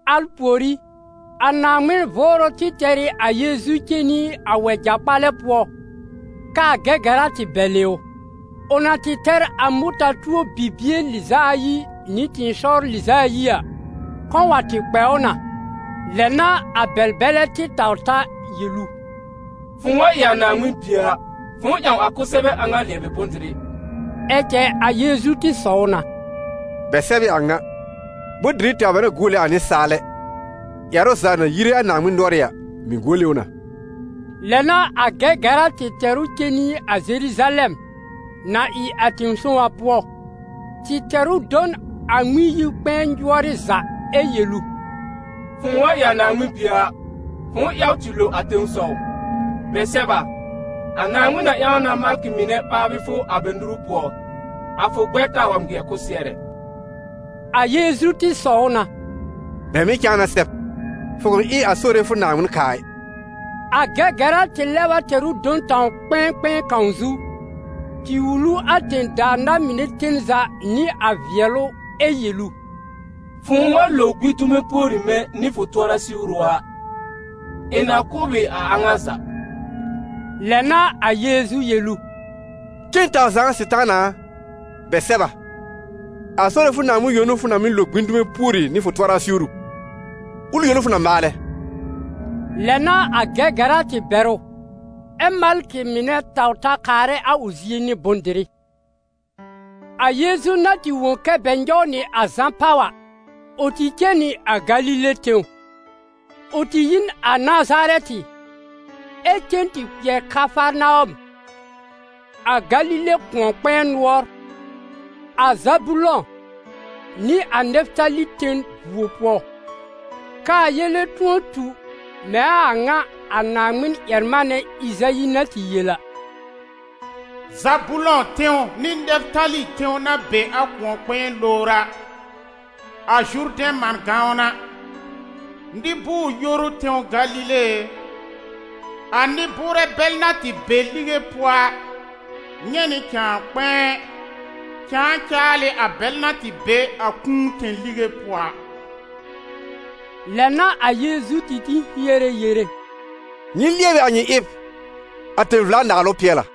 Al pùorí, a Naaŋmɩn Vʋʋrʋ tɩ tɛr ɩ a Yeezu cen nɩ a wɛja-kpalɛ pʋɔ, k'aa Gɛgɛra tɩ bɛlɩ ʋ. Ʋ na tɩ tɛr a mʋta-tuo bibie lɩz'a ayi nɩ tɩ̃ɩsɔwr lɩz'a ayi a, kɔ̃ wa tɩ kpɛ ʋ na. Lɛ n'a a bɛl-bɛlɛ tɩ taw ta yel ʋ: «Fʋ̃ʋ wa ɩ a Naaŋmɩn Bie a, fʋ̃ʋ ƴãw a kʋsɛbɛ a ŋa lɩɛbɩ bʋ̃-dɩrɩ.» Ɛ cɛ a Yeezu tɩ sɔw na: «Bɛ sɛb ɩ a ŋa: ‹Bʋ̃-dɩrɩ tɛwr bɛ n'a guole a nɩsaal ɛ, ƴɛrʋ za na yire a Naaŋmɩn nʋɔrɩ́ a, mɩ̀ guole ʋ na.›» Lɛ n'a a Gɛgɛra tɩ tɛr ʋ cen nɩ a Zeruzalɛm, na ɩ a tẽ-sõw a pʋɔ, tɩ tɛr ʋ do n a Ŋmɩn-yi-kpɛ̃ɛ nyʋɔrɩ́ za, ɛ́ yel ʋ: «Fʋ̃ʋ wa ɩ a Naaŋmɩn Bie a, fʋ̃ʋ yaw tɩ lo a tẽsɔw; bɛ sɛb a: ‹A Naaŋmɩn na ƴãw na malkɩ mɩnɛ ɓaabɩ fʋ a bɛ nuru pʋɔ, a fʋ gbɛr taa wa ŋmɩɛr kʋsɩɛr ɛ.›» A Yeezu tɩ sɔw na: «Bɛ mɩ̀ cãa na sɛb: ‹Fʋ kʋ̃ ɩ a Sore fʋ Naaŋmɩn kaa ɩ.›» A Gɛgɛra tɩ lɛb a tɛr ʋ do n tãw-kpɛ̃ɛ kpɛ̃ɛ kãw zu, tɩ wul ʋ a tẽ-daa na-mɩnɛ ten za nɩ a vɩɛlʋ ɛ yel ʋ: «Fʋ̃ʋ wa lo gbĩ dume pùori mɛ̃ nɩ fʋ tʋɔra siwru a, ɩ̃ na kʋ̀ b ɩ a a ŋa za.» Lɛ n'a a Yeezu yel ʋ: «Cen taw zaa, Sɩtaana a! Bɛ sɛb a: ‹A Sore fʋ Naaŋmɩn yõ n'ʋ fʋ na mɩ́ lo gbĩ dume pùori nɩ fʋ tʋɔra siwru, ʋl yõ n'ʋ fʋ na maalɛ.›» Lɛ n'a a Gɛgɛra tɩ bɛr ʋ, ɛ́ malkɩ mɩnɛ taw ta kaarɛ a ʋ zie nɩ bʋ̃-dɩrɩ. A Yeezu na tɩ wõ kɛ́ bɛ nyɔw nɩ a Zã pàw a, ʋ tɩ cen nɩ a Galile tẽw. Ʋ tɩ yi n a Nazarɛtɩ, ɛ cen tɩ kpɩɛr Kafarnawɔm, a Galile kʋ̃ɔ-kpɛ̃ɛ nʋɔr, a Zabulɔ̃ nɩ a Nɛfɩtali ten vuo pʋɔ, k'aa yele tʋ̃ɔ tu mɛ̃ a a ŋa a Naaŋmɩn-ƴɛr-manɛ Ɩzayi na tɩ yel a: «Zabulɔ̃ tẽw nɩ Nɛfɩtali tẽw na be a kʋ̃ɔ-kpɛ̃ɛ lowr a, a Zurdɛ̃ man gãwn a, nɩ-bʋʋr-yoru tẽw Galile e! A nɩ-bʋʋrɛ bɛl na tɩ be lige pʋɔ a, nyɛ̃ nɩ cãa kpɛ̃ɛ; cãa caal ɩ a bɛl na tɩ be a kũu tẽ-lige pʋɔ a.» Lɛ n'a a Yeezu tɩ tĩ hiere yere: «Nyɩ lɩɛbɩ a nyɩ ɩb, a tẽ-vla-naalʋ pɩɛl a.»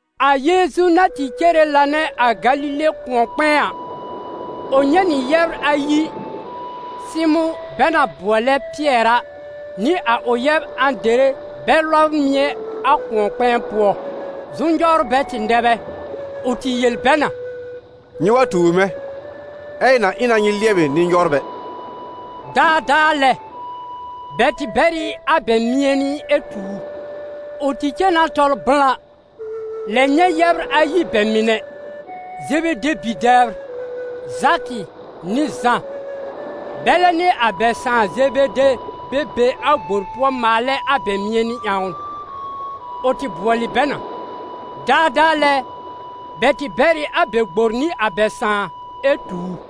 A Yeezu na tɩ cere lanɛ a Galile kʋ̃ɔ-kpɛ̃ɛ a, ʋ nyɛ̃ nɩ yɛbr ayi, Sɩmʋ̃ bɛ na bʋɔlɛ Pɩɛr a, nɩ a ʋ yɛb Ãdere bɛ lɔbr mɩ̃ɛ a kʋ̃ɔ-kpɛ̃ɛ pʋɔ, zʋm-nyɔwrbɛ tɩ nɛ bɛ. Ʋ tɩ yel bɛ na: «Nyɩ wa tuur mɛ̃, ɛ ɩ̃ na ɩ na nyɩ lɩɛbɩnɩ-nyɔwrbɛ.» Daadaa lɛ, bɛ tɩ bɛr ɩ a bɛ mɩ̃ɛnɩ ɛ tu ʋ. Ʋ tɩ cen na tɔl blã, lɛb nyɛ̃ yɛbr ayi bɛ mɩnɛ, Zebede bi-dɛbr, Zakɩ nɩ Zã, bɛlɛ nɩ a bɛ sãà Zebede bɛ be a gbor pʋɔ maalɛ a bɛ mɩ̃ɛnɩ ƴãwn. Ʋ tɩ bʋɔlɩ bɛ na. Daadaa lɛ, bɛ tɩ bɛr ɩ a bɛ gbor nɩ a bɛ sãà ɛ tu ʋ.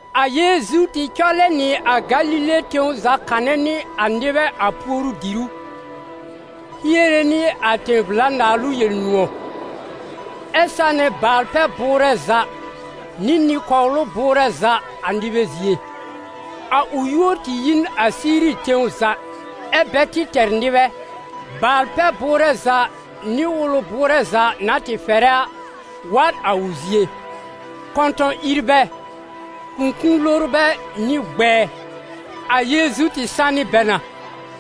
A Yeezu tɩ cɔlɛ nɩ a Galile tẽw za kanɛ nɩ a nɩbɛ a puoru-dìrú, hiere nɩ a tẽ-vla-naalʋ Yel-nʋ̃ɔ̀, ɛ sanɛ baal-pɛ-bʋʋrɛ za nɩ nɩ-kɔwlʋ bʋʋrɛ za a nɩbɛ zie. A ʋ yúor tɩ yi n a Siiri tẽw za, ɛ́ bɛ tɩ tɛr nɩbɛ, baal-pɛ-bʋʋrɛ za nɩ wʋlɛ bʋʋrɛ za na tɩ fɛrɛ a, wa n a ʋ zie: kɔ̃tɔ̃-ìrbɛ, kũkũ-lorbɛ nɩ gbɛɛ. A Yeezu tɩ sanɩ bɛ na.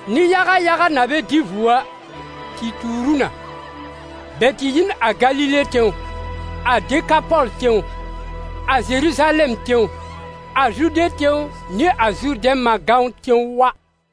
Nɩ-yaga yaga na bɛ dɩ vuo a, tɩ tuur ʋ na; bɛ tɩ yi n a Galile tẽw, a Dekapɔl tẽw, a Zeruzalɛm tẽw, a Zude tẽw nɩ a Zurdɛ̃ man gãwn tẽw wa.